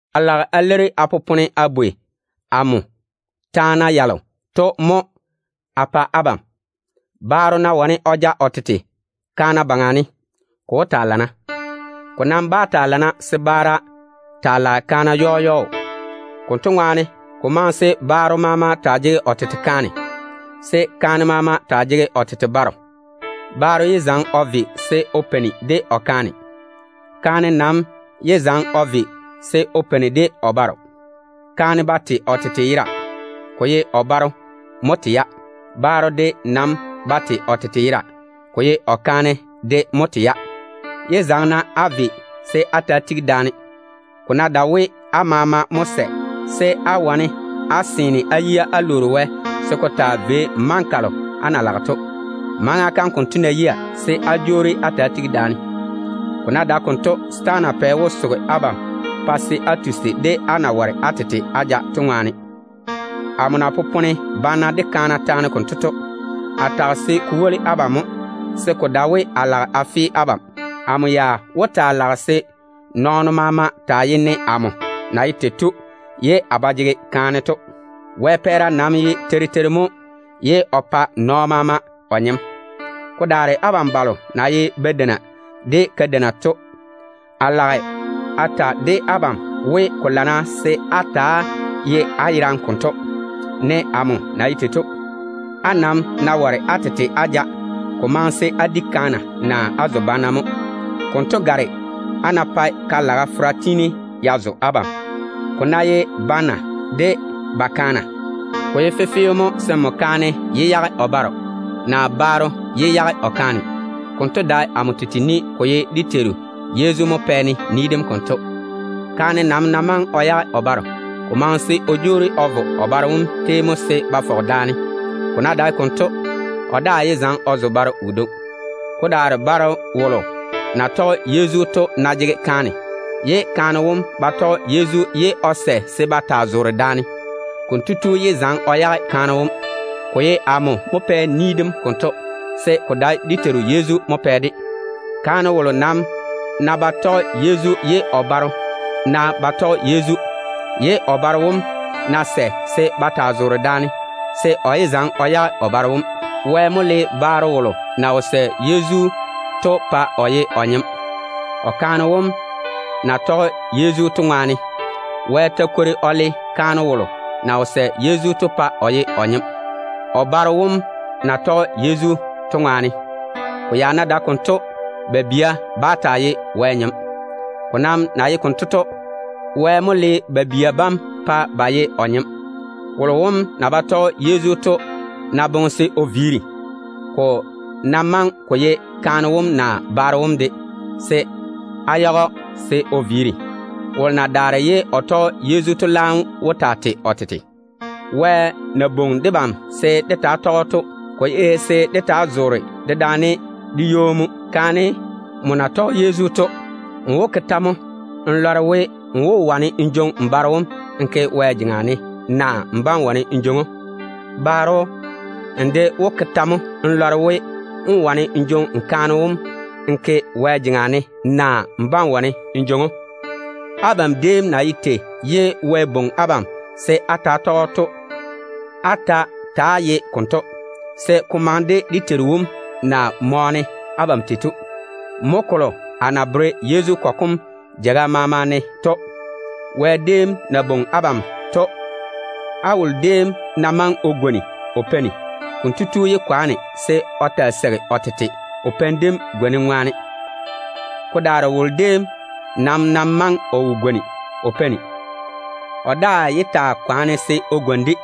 A lage a leiri á na popone á bwei amo taana yalo to mo a pa abam. Baaro ná wane o ja o tete kaana baŋa ne, ko wó taa lana. Ko nam ba lana se baara taa lage kaana yɔɔ yɔɔ. Konto ŋwaane, ko maŋe se baaro maama taa jege o tete kaane, se kaane maama de taa jege o tete baro. Baaro yé zaŋe o ve se o peini de o kaane. Kaane nam yé ve se o peini de o baro. Kaane ba tei o tete yera, ko ye o baro mo tei-ya. Baaro de nam ba tei o tete yera, ko ye o kaane de mo tei-ya. Yé zaŋe-na á ve se á ta‑á tigi daane, ko ná dae we á maama mo sɛ se á yage da-peiga, se á wane á seene á yia á lwoori Wɛ se ko taa vei maŋa kalo á na lage to. Maŋa kam konto ná yia, se á jwoori á ta‑á tigi daane. Ko ná dae konto, setaana pɛ wó soge abam pa á tusi, á na ware á tete á ja to ŋwaane. Amo na popone banna de kaana taane konto to, a tage se ko woli abam mo, se ko dae we a lage a fe abam. Amo ya wó taa lage se nɔɔno maama taa ye ne amo na ye tei to. Wɛ pɛɛra nam ye teiri teiri mo ye o pa nɔɔno maama o nyem. Ko daare abam balo na ye badeina de kadeina to, a lage a ta de abam we, ko lana se á ta‑á ye á yerane konto, ne amo de na ye tei to. Á nam ná ware á tete á ja, ko maŋe se á di kaana naa á zo banna mo. Konto gare á ná pae ka-laga fera tiini ya zo abam. Ko ná ye banna de ba kaana, ko ye fefeo mo se kaane yé yage o baro, se baro de yé yage o kaane. Konto dae amo tete ni, ko ye dé Teiru Yezu mo pɛ-ne ni dem konto. Kaane nam ná maŋe o yage o baro, ko maŋe se o jwoori o vo o baro wom tei mo se ba fɔge daane. Ko ná dae konto, o daa yé zaŋe o zo baro wodwoŋi. Ko daare baaro wolo na tɔge Yezu to ná jege kaane wolo na ba tɔge Yezu to, ye kaane wom ná sɛ se ba taa zoore daane, baaro wom ba jege chwoŋa se o yage o kaane wom. Ko ye amo mo pɛ ni dem konto, se ko dae dé Teiru Yezu mo pɛ-de. Kaane wolo nam ná tɔge Yezu ye o baro ná ba tɔge Yezu, ye o baro wom ná sɛ se ba taa zoore daane, se o yé zaŋe o yage o baro wom. Wɛ mo le baro wolo na wo sɛ Yezu to pa o ji o nyem, o kaane wom na tɔge Yezu to ŋwaane. Wɛ ta kwori o le kaane wolo na wo sɛ Yezu to pa o ji o nyem, o baro wom na tɔge Yezu to ŋwaane. Ko ya ná dae konto, ba bia bá taa ye ba yera Wɛ ŋwaane. Ko nam na ye tei to, Wɛ mo le ba bia bam pa ba ye o nyem. Wolo wom na ba tɔge Yezu to ná boŋe se o viiri, ko ná maŋe ko ye kaane wom naa baro wom de, se á yage‑o se o viiri. Wolo na daare ye o tɔge Yezu to laam wó taa tei o tete. Wɛ na bwoŋi debam se dé taa tɔge‑o to, ko ye se dé taa zoore daane de wo-zuru mo. Kaane, nmo na tɔge Yezu to, n wó ke tɛ mo n lɔre we, n wó wane n jwoŋi n baro wom n ke Wɛ jeŋa ne, naa n bá‑n wane n jwoŋi‑o? Baro, n de wó ke tɛ mo n lɔre we, n wó wane n kaane wom n jwoŋi n ke Wɛ jeŋa ne, naa n bá‑n wane n jwoŋi‑o? Abam déem na ye tei ye Wɛ bwoŋi abam se á ta‑á tɔge‑o to, á ta ta‑á ye konto, se ko maŋe de dé Teiru wom na mɔɔne abam tei to. Mo kolo a na bere Yezu kɔgɔ kom jeiga maama ne to. Wɛ déem na bwoŋi abam to, á wolo déem ná maŋe o gwoni o peini, konto tu yé kwaane se o taa seigi o tete o peini dem gwonim ŋwaane. Ko daare wolo déem nam ná maŋe o wo gwoni o peini, o daa yé kwaane se o gwoni-de.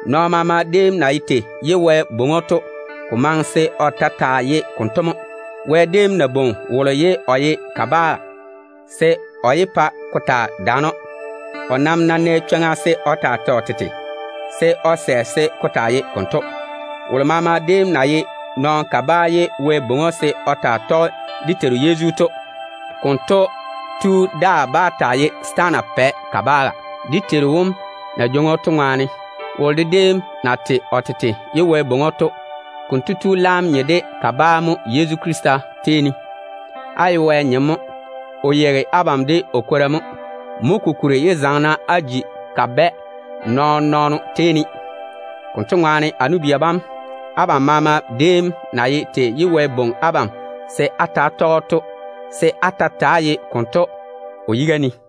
Nɔɔno maama déem na ye tei ye Wɛ bwoŋi‑o to, ko maŋe se o ta taa ye konto mo. Wɛ déem ná bwoŋi wolo ye o ye kabaa, se kotu yé pa ko taa daane‑o. O nam ná nɛ chwoŋa se o taa tei o tete, se o sɛ se ko taa ye konto. Wolo maama déem na ye nɔɔno kabaa ye Wɛ bwoŋi‑o se o taa tɔge dé Teiru Yezu to, konto tu laam tei o tete, dé Teiru wom na jwoŋi‑o to ŋwaane. Wolo de déem na tei o tete ye Wɛ bwoŋi‑o to, konto tu laam nye de kabaa mo Yezu Krista tei ne. Á ye Wɛ nyem mo. O yeigi abam de o kwora mo. Mo kokuri yé zaŋe-na á ji kabɛ nɔɔn-nɔɔno tei ne. Konto ŋwaane, a nu-bia bam, abam maama déem na ye tei ye Wɛ bwoŋi abam se á ta‑á tɔge‑o to, se á ta ta‑á ye konto o yiga ne.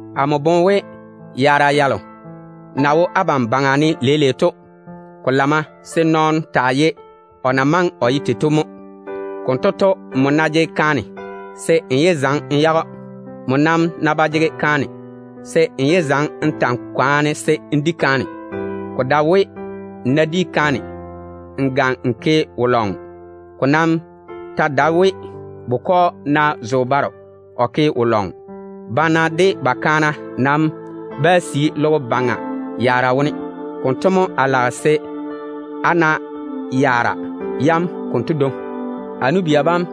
Amo boŋe we, yaara yalo na wo debam baŋa ne leile to ŋwaane, ko lamma se nɔɔno taa ye o na maŋe o ye tei to mo. Konto to, nmo ná jege kaane, se n yé zaŋe n yage‑o. Nmo nam ná ba jege kaane, se n yé zaŋe n ta‑n kwaane se n di kaane. Ko dae we, n ná di kaane, n ga n ke wo-lɔŋɔ. Ko nam ta dae we, bukɔ ná zo baro, o ke wo-lɔŋɔ. Banna de ba kaana nam bá sii logo baŋa yaara yam wone. Konto mo a ba lage se á yaare konto dwoŋi. A nu-bia bam,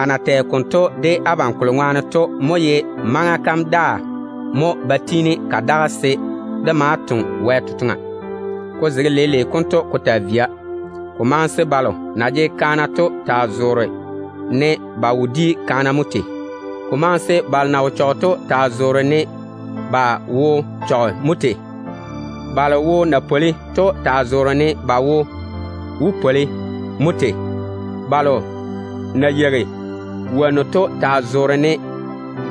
a na tɛ konto de abam kolo ŋwaane to mo ye maŋa kam daa ba tiini ka daga se dé maa toŋe Wɛ totoŋa. Ko zege leile konto ko taa via, ko maŋe se balo na jege kaana to taa zoore ne ba wo di kaana mo tei. Ko maŋe se balo wo na chɔge to taa zoore ne ba wo wo chɔge mo tei. Balo wo na pwoli to de taa zoore ne ba wo wo pwoli mo tei. Balo na yeigi wonnu to taa zoore ne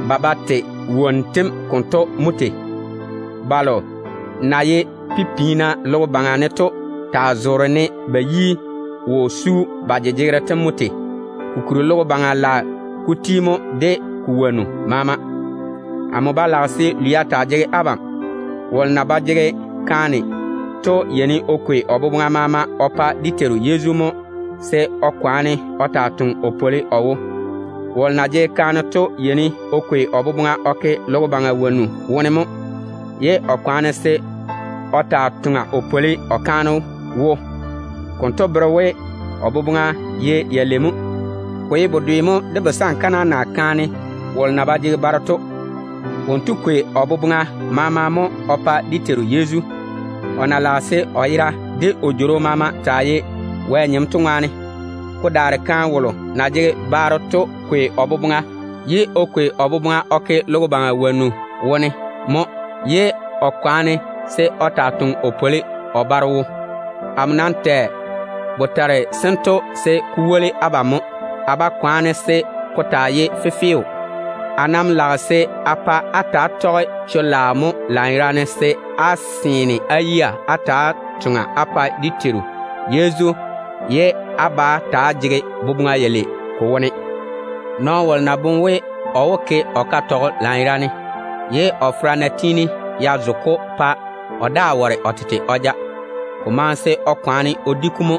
ba ba tei wonnu tem konto mo tei. Balo na ye pipim-piina logo baŋa ne to taa zoore ne ba yi wo su ba jejegero tem mo tei. Kokuri logo baŋa de ko wonnu maama lage te ti mo. Amo ba lage se lwia taa jege abam. Wolo na ba jege kaane to yeini o kwei o boboŋa maama o pa dé Teiru Yezu mo, se o taa toŋe o pwoli o wo. Wolo na jege kaane to yeini o kwei o boboŋa o ke logo baŋa wonnu wone mo, ye o kwaane o taa toŋa o pwoli o kaane wo. Konto bere we, o boboŋa ye yalei mo. Ko ye bedwe mo de busankana, naa kaane wolo na ba jege baro to. Wonto kwei o boboŋa maama mo o pa dé Teiru Yezu, o na lage se o yera de o jworo maama taa ye Wɛ nyem to ŋwaane. Ko daare kaane wolo na jege baro to kwei o boboŋa o ke logo baŋa wonnu wone mo, ye o kwaane se o taa toŋe o pwoli o baro wom wo. Amo nam tɛ botare sento se ko woli abam mo. A ba kwaane se ko taa ye fefeo á tei ne. Amo nam lage se a pa á ta‑á tɔge chwo-laao mo, se á seene á yia á ta‑á toŋa á pa dé Teiru Yezu ye á ba jege boboŋa yalei ko wone. Nɔɔno wolo ná boŋe we, o wo ke o katɔgɔ lanyerane, ye o fera ná tiini ya zo‑o pa o daa ware o tete o ja, ko maŋe se kotu kwaane o di‑o mo,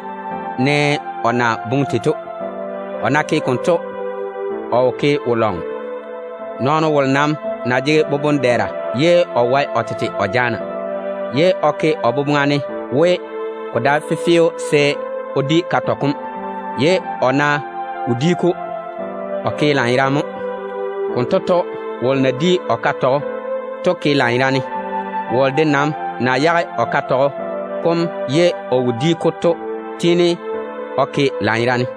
ne o na boŋe tei to. O ná ke konto, o wo ke wo-lɔŋɔ. Nɔɔno wolo nam ná jege boboŋ-dɛɛra ye o wae o tete o jaana, ye kotu ná ke o boboŋa ne we, ko dae fefeo se o di katɔgɔ kom, ye o ná wo di‑o, o ke lanyerane mo. Konto to, wolo na di o katɔgɔ to ke lanyerane. Wolo de nam na yage o katɔgɔ kom ye o wo di‑o to tiini o ke lanyerane.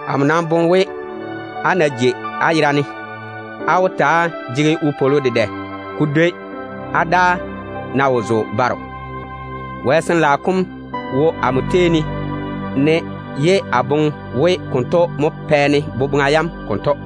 Amo nam boŋe we, o ná jei o yerane, o wó taa jege wopwolo dedɛ ko dwoi o daa ná zo baro. Wɛ Sin-laao kom wo amo tei ne, ye a boŋe we konto mo pɛ-ne boboŋa yam konto.